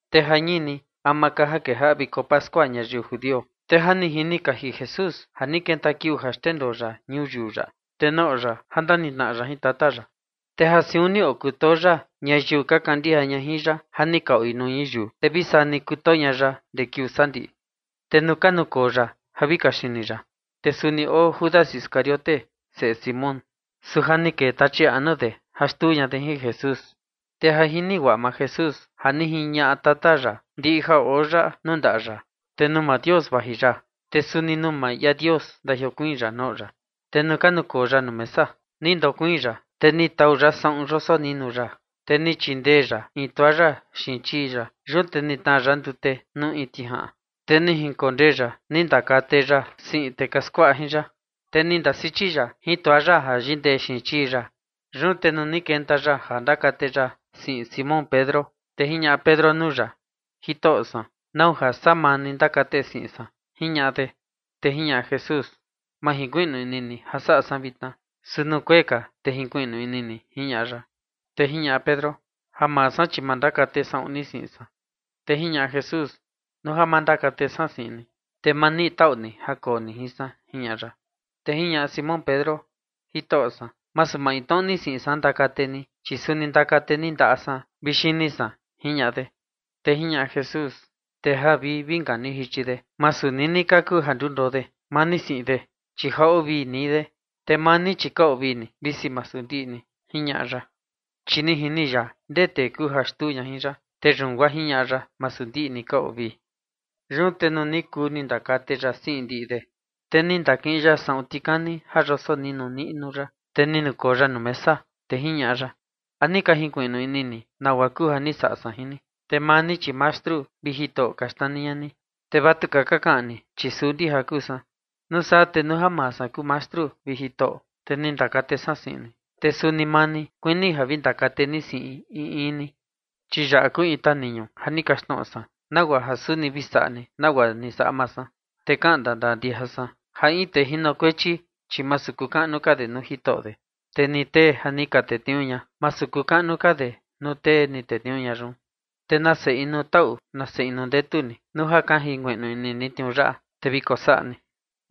Te jañini ama ka ja kejaꞌa viko pascua ñayiu judio, te ja ni jini kaji Jesús ja ni kenta kiuu ja xndendoo ya ñuyiu yaꞌa, te noꞌo ya ja ndanitnaꞌa ya jin Tata ya. Te ja siun ni okutoo ya ñayiu maa ya ja ka oi nuu ñuyiu, te vi saa ni kutoo ña ya guaa ndee kiuu sandiꞌi. Te nuu ka nukoo ya ja vi kaxini ya, te suni oo Judas Iscariote, seꞌe Simón. Su ja ni kee tachi anu de ja xtuu ña de jin Jesús. Te ja jini guaꞌa maa Jesús ja ni jiñaꞌa Tata ya ndiꞌi ja oo yaꞌa nuu ndaꞌa ya, te nuu maa Dios vaji ya, te suni nuu maa ia Dios ndajiokuiin ya noꞌo ya. Te nuu ka nukoo ya nuu mesa, ni ndakoo ya, te ni tau ya saꞌun yosoninu niꞌnu ya, te ni chindee ya in toalla xiin chii ya. Yun te ni tnaa ya ndute nuu in tijaꞌan, te ni jinkondee ya ni ndakate ya siꞌin tee ka skuaꞌa jin ya, te ni ndasichi ya jin toalla ja yindee xiin chii ya. Yun te nuu ni kenta ya ja ndakate ya siꞌin Simón Pedro, te jiñaꞌa Pedro nuu ya: ―Jitoꞌo san, ¿nau ja saa maa ni ndakate siꞌin san? ―jiñaꞌa de. Te jiñaꞌa Jesús: ―Ma junkuiꞌnu ini ni ja saꞌa san vitna, su nuu kuee ka, te junkuiꞌnu ini ni ―jiñaꞌa ya. Te jiñaꞌa Pedro: ―Ja maa san, chi ma ndakate saꞌun ni siꞌin san. Te jiñaꞌa Jesús: ―Nuu ja ma ndakate san siꞌin ni, te ma niꞌi taꞌu ni ja koo ni jin san ―jiñaꞌa ya. Te jiñaꞌa Simón Pedro: ―Jitoꞌo san, masu maintnoꞌo ni siꞌin san ndakate ni, chi suni ndakate ni ndaꞌa san vi xini san ―jiñaꞌa de. Te jiñaꞌa Jesús: ―Tee ja vi inka ni jichi de, tu jiniuꞌu ka ja ndundoo de, maa ni siꞌin de, chi ja oo vii nii de. Te maa ni, chi ja ka oo vii ni, visi masu ndiꞌi ni ―jiñaꞌa ya. Chi ni jini ya ndee tee kuu ja xtuu ña jin ya, te yun guaa jiñaꞌa ya: “Masu ndiꞌi ni ka oo vii”. Yun te nuu ni kuu ni ndakate ya siꞌi ndiꞌi de, te ni ndakiꞌin ya saꞌun tikani ja yosoninu niꞌnu ya, te ni nukoo ya nuu mesa, te jiñaꞌa ya: ―¿A ni ka junkuiꞌnu ini ni nagua kuu ja ni saꞌa san jin ni? Te maa ni chi “Mastru” vi “Jitoꞌo” ka xnani ña ni, te vatuka ka kaꞌan ni, chi suu ndija kuu san. Nuu saa te nuu ja maa san kuu Mastru vi Jitoꞌo, te ni ndakate san siꞌin ni, te suni maa ni, kuini ja vi ndakate ni siꞌin in in ni. Chi yaꞌa kuu in taniñu ja ni kaxtnoꞌo san, nagua ja suni vi saꞌa ni nagua ni saꞌa maa san. Te kaꞌan ndandaa ndija san ja in tee jinokuechi, chi masu kuu kaꞌnu ka de nuu jitoꞌo de. Te ni tee ja ni ka tetniuu ña, masu kuu kaꞌnu ka de nuu tee ni tetniuu ña yun. Te nase inu taꞌu nase inu ndetu ni nuu ja ka junkuiꞌnu ini ni tniuu yaꞌa, te vi kosaꞌa ni. Te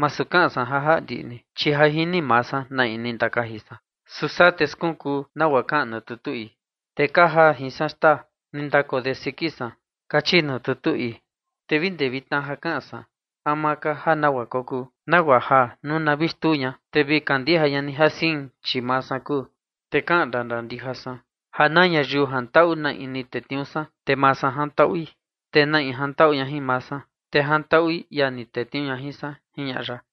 masu kaꞌan san ja jaꞌa ndiꞌi ni, chi ja jini maa san na in ni ndakaji san. Su saa te skunkuu nagua kaꞌan nuu tutu ii: Tee ka jaa in ni jin san xtaa ni ndakoo de siki san. Kachi nuu tutu ii. ’Te vi ndee vitna ja kaꞌan san, ama ka ja nagua kokuu, nagua ja nuu na vi xtuu ña, te vi kandija ña ni ja sein, chi Maa San Kuu. Te kaꞌan ndandaa ndija san ja na ñayiu jantaꞌu na in ni tetniuu san, te maa san jantaꞌui, te na in jantaꞌu ña jin maa san, te jantaꞌui ia ni tetniuu ña jin san ―jiñaꞌa ya.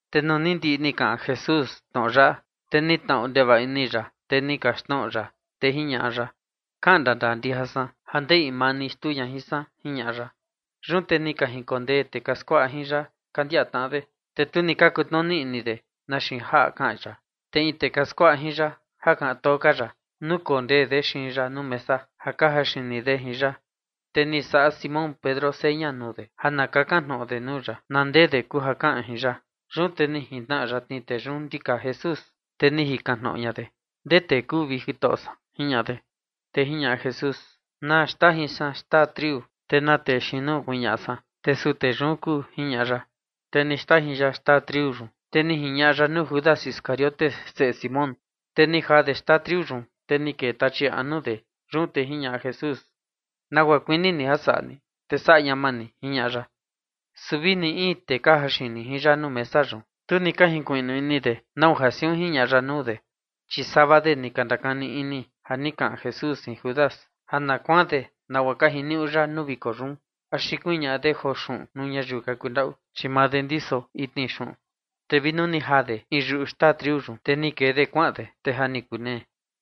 Te nuu ni ndiꞌi ni kaꞌan Jesús tnoꞌo yaꞌa, te ni tnaꞌu ndevaꞌa ini ya, te ni kaxtnoꞌo ya, te jiñaꞌa ya: ―Kaꞌan ndandaa ndija san ja in maa ni xtuu ña jin san ―jiñaꞌa ya. Yun te ni ka jinkondee tee ka skuaꞌa jin ya ka ndiaꞌa tnaꞌa de, te tu ni ka kutnuni ini de na xiin jaꞌa kaꞌan ya. Te in tee ka skuaꞌa jin ya ja kaꞌan too ka ya, nukondee de xiin ya nuu mesa ja ka jaxini de jin ya. Te ni saꞌa Simón Pedro seña nuu de ja na kakan tnoꞌo de nuu ya na ndee de kuu ja kaꞌan jin ya. Yun te ni jintnaꞌa yatni tee yun ndika Jesús, te ni jikan tnoꞌo ña de: ―¿Ndee tee kuu, vi Jitoꞌo san? ―jiñaꞌa de. Te jiñaꞌa Jesús: ―Na xndajin san xtaa triu, te na tee xiin nuu kuñaꞌa san, te suu tee yun kuu ―jiñaꞌa ya. Te ni xndajin ya xtaa triu yun, te ni jiñaꞌa ya nuu Judas Iscariote, seꞌe Simón. Te ni jaa de xtaa triu yun, te ni kee Tachi anu de. Yun te jiñaꞌa Jesús: ―Nagua kuini ni ja saꞌa ni, te saꞌa ñama ni ―jiñaꞌa ya. Su vi ni in tee ka jaxini jin ya nuu mesa yun, tu ni ka junkuiꞌnu ini de nau ja siun jiñaꞌa ya nuu de. Chi sava de ni ka ndakani ini ja ni kaꞌan Jesús jin Judas ja na kuaan de nagua ka jiniuꞌu ya nuu viko yun, axi kuñaꞌa de joo xuꞌun nuu ñayiu ka kundaꞌu, chi maa de ndiso itni xuꞌun. Te vi nuu ni jaa de in yuꞌu xtaa triu yun, te ni kee ni de kuaꞌan de, te ja ni kunee.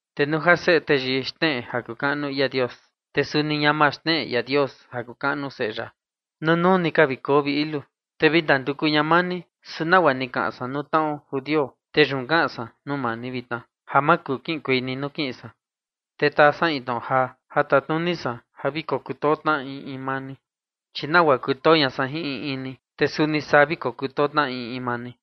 Te nuu ja Seꞌe Teyii xneꞌe ja kuu kaꞌnu ia Dios, te suni ñama xneꞌe ia Dios ja kuu kaꞌnu Seꞌe ya. Nunuu ni ka vi koo, vi ilu. Te vi ndanduku ña maa ni, su nagua ja ni kaꞌan san nuu tnaꞌo judio, te yun kaꞌan san nuu maa ni vitna ja ma kuu kiꞌinkuei ni nuu kiꞌin san. Te taa san in tnoꞌo jaa ja tatnuni san ja vi kokutoo tnaꞌa in in maa ni. Chi nagua kutoo ña san jin in in ni, te suni saa vi kokutoo tnaꞌa in in maa ni.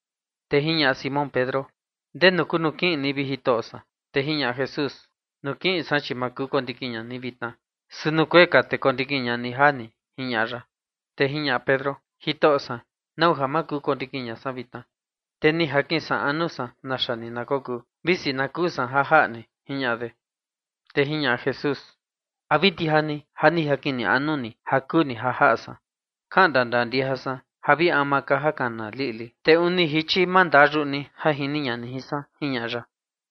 Te jiñaꞌa Simón Pedro: ―¿Ndenu kuu nuu kiꞌin ni, vi Jitoꞌo san? Te jiñaꞌa Jesús: ―Nuu kiꞌin san, chi ma kuu kondikin ña ni vitna, su nuu kuee ka, te kondikin ña ni jaa ni ―jiñaꞌa ya. Te jiñaꞌa Pedro: ―Jitoꞌo san, ¿nau ja ma kuu kondikin ña san vitna? Te oo anu san naxa ni na kokuu, visi na kuu san ja jaꞌa ni ―jiñaꞌa de. Te jiñaꞌa Jesús: ―¿A vi ndija ni ja vi oo anu ni ja kuu ni ja jaꞌa san? Kaꞌan ndandaa ndija san ja vi ama ka ja kana liꞌli, te uni jichi ma ndaa yuꞌu ni ja jini ña ni jin san ―jiñaꞌa ya.